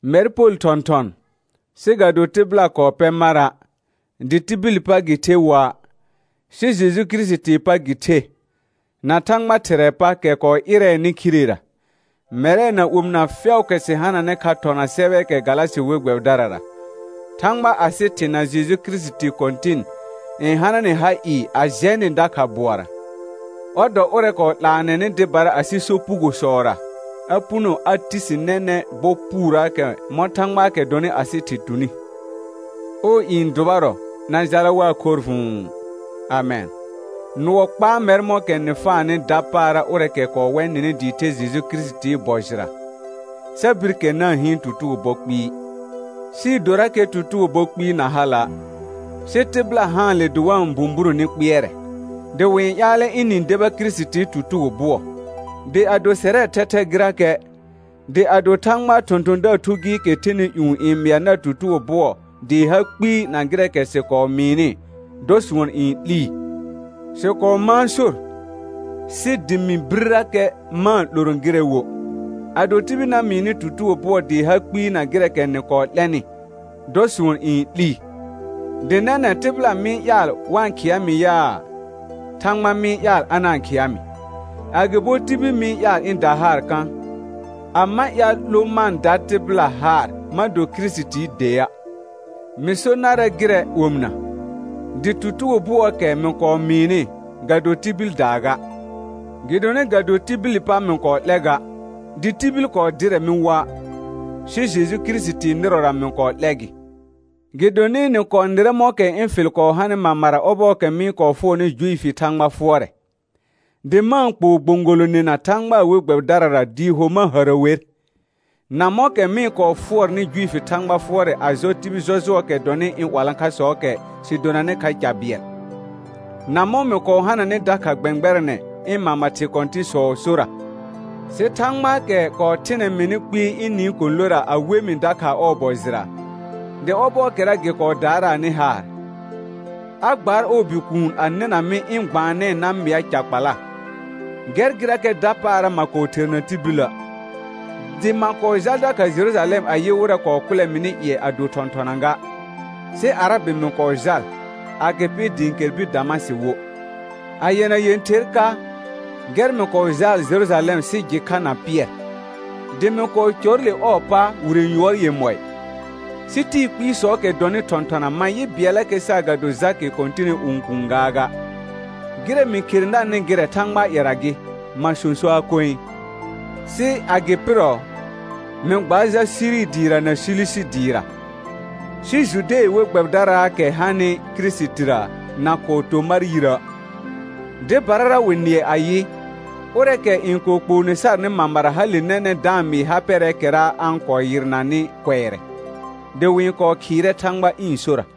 Mɛr Pol thɔ̃thɔn, sɩ ga do tɩbɩla kɔɔ pɛ mara', dɩ tibili pa gɩ the woa', sɩ Jeju Kirisitii pa gɩ the, na Thãgba Thɩrɛɛ pa kɛ kɔɔ ɩrɛɛnɩ khirera; mɛrɛ na omɩna fɛʋʋkɛ sɩ hananɩ kha thɔna sɛbɛɛkɛ Galasɩ we gbɛbɩdarara. Thãgba asɩ Thɩ na Jeju Kirisiti Kɔ̃tɩn, n hana nɩ ha ɩɩ a jɛ nɩ dakha bʋɔra. Ɔr dɔ ʋrɛ kɔɔ 'laanɛnɩ dɩbara asɩ sopugosɔra a puno a ti si nɛnɛ̃ bɔ puurəəkɛ mɔ̃ Thãgbaakɛ dɔnɩ asɩ Thɩ tuni; ɔɔ i n dʋbarɔ na jala waa khorr vʋ̃ʋ. Amɛn. Nʋɔ kpaa mɛr mɔ̃kɛ nɩ faanɩ dapaara ʋrɛɛkɛ kɔɔ wɛ nɩnɩ dɩɩ the Kirisitii bɔ jɩra, sa bir kɛr na-n hɩɩn tutugo bɔ kpɩɩ, sɩɩ dorakɛ tutugo bɔ kpɩɩ na hala'; sɩ tɩbɩla haanle dɩ wa-n bũburõ ni kpɩɛrɛ, dɩ wɩ-n ƴaalɛ ɩnɩ-n deba Kirisitii tutugo bʋɔ. Dɩ ado sɛrɛɛ thɛthɛ gɩrakɛ, dɩ ado Thãgbaa thɔ̃thɔ̃daar thu gɩɩkɛ thɛnɩ ƴũ n mɩa nar tutugo bʋɔ dɩɩ ha kpɩɩ na gɩrɛɛkɛ sɩ kɔɔ mɩɩnɩ, dɔ sʋɔn n 'lii. Sɩ kɔɔ mãa sor, sɩ dɩ mɩ birrakɛ ma-n 'loro gɩrɛ wo, ado tibil na mɩɩ nɩ tutugo bʋɔ dɩɩ ha kpɩɩ na gɩrɛɛkɛ nɩ kɔɔ 'lɛnɩ, dɔ sʋɔn n 'lii. Dɩ nɛnɛ̃ tɩbɩla mɩ-n ƴaal wa-n khɩa mɩ yaa, Thãgba mɩ-n ƴaal a na-n khɩa mɩ? Agɩbo tibil mɩ-n ƴaal ɩ̃ da haar kã? A ma ƴaal 'lo ma-n da tɩbɩla haar ma do Kirisitii dea'. Mɩ so narɛ gɩrɛ omɩna, dɩ tutugo bʋɔɔkɛ mɩ kɔɔ mɩɩnɩ, ga do tibildaa ga; gɩdonɩ ga do tibili pa mɩ kɔɔ 'lɛ ga, dɩ tibil kɔɔ dɩrɛ mɩ woa', sɩ Jeju Kirisitii nɩrɔra mɩ kɔɔ 'lɛ gɩ. Gɩdonɩ nɩ kɔɔ nɩrɛ mɔ̃kɛ ɩ̃ fɩl kɔɔ hanɩ mamara ɔbɔɔkɛ mɩ-n kɔɔ fʋɔrnɩ Juifi Thãgba fʋɔrɛ, dɩ ma-n kpoo gbõgolonena Thãgbaa we gbɛbɩdarara dɩɩ ho ma hərə wer, na mɔ̃kɛ mɩ-n kɔɔ fʋɔrnɩ Juifi Thãgba fʋɔrɛ a jɔ tibil jɔjʋɔɔkɛ dɔnɩ ɩ̃ 'walãkhasɔɔkɛ sɩ donanɩ kha ca bɩɛl, na mɔ̃ mɩ kɔɔ hananɩ dakha gbɛ̃gbɛrɛnɛ ɩ̃ mama thɩ kɔ̃tɩ̃sɔɔ sora. Sɩ Thãgbaakɛ kɔɔ thɩnɛ mɩnɩ kpɩɩ ɩ̃ nɩɩ kɔ̃lora a we mɩ dakha ɔɔ bɔ jɩra, dɩ ɔbɔɔkɛra gɩ kɔɔ daaraanɩ haar, a gbaar ɔɔ Bikuun a nɩna mɩ ɩ̃ gbaanɛɛ na mɩa ca kpala, gɛr gɩrakɛ dapaara ma kɔɔ therna tibilə', dɩ ma kɔɔ jal dakha Jerujalɛm a yɩ wɩrɛ kɔɔ kʋlɛ mɩnɩ ƴɩɛ a do thɔ̃thɔna ga, sɩ Arabɩ mɩ kɔɔ jal, agɩpɩ dɩ ɩ̃ kɛr bir Damasɩ wo. A yɛna yẽther ka, gɛr mɩ kɔɔ jaal Jerujalɛm sɩ jɩ kha na Pɩɛr, dɩ mɩ kɔɔ cɔr le ɔɔ pa wire yʋɔr yemɔɩ; sɩ tɩɩ kpɩɩsɔɔkɛ dɔnɩ thɔ̃thɔna ma yɩ bɩɛllakɛ saagado Jakɩ Kɔ̃tɩnɩ õkuun gaaga. Gɩrɛ mɩ khere narnɩ gɩrɛ Thãgbaa ƴɛra gɩ, ma sõsoaa koe. Sɩ a gɩ pɩrɔ, mɩ gbaar jal Siri dɩɩra na Silisi dɩɩra. Sɩ Jude we gbɛbɩdaraakɛ hanɩ Kirisitira na kɔɔ to mar yirə'; dɩbarara wɩ nɩɛ ayɩ: Ʋrɛɛkɛ n kɔɔ kpoone sarnɩ mamara hale nɛnɛ̃ da-n mɩɩ ha pɛrɛɛkɛra a-n kɔɔ yɩrnanɩ kʋɛrɛ; dɩ wɩ-n kɔɔ khɩɩrɛ Thãgba ɩ̃ sora.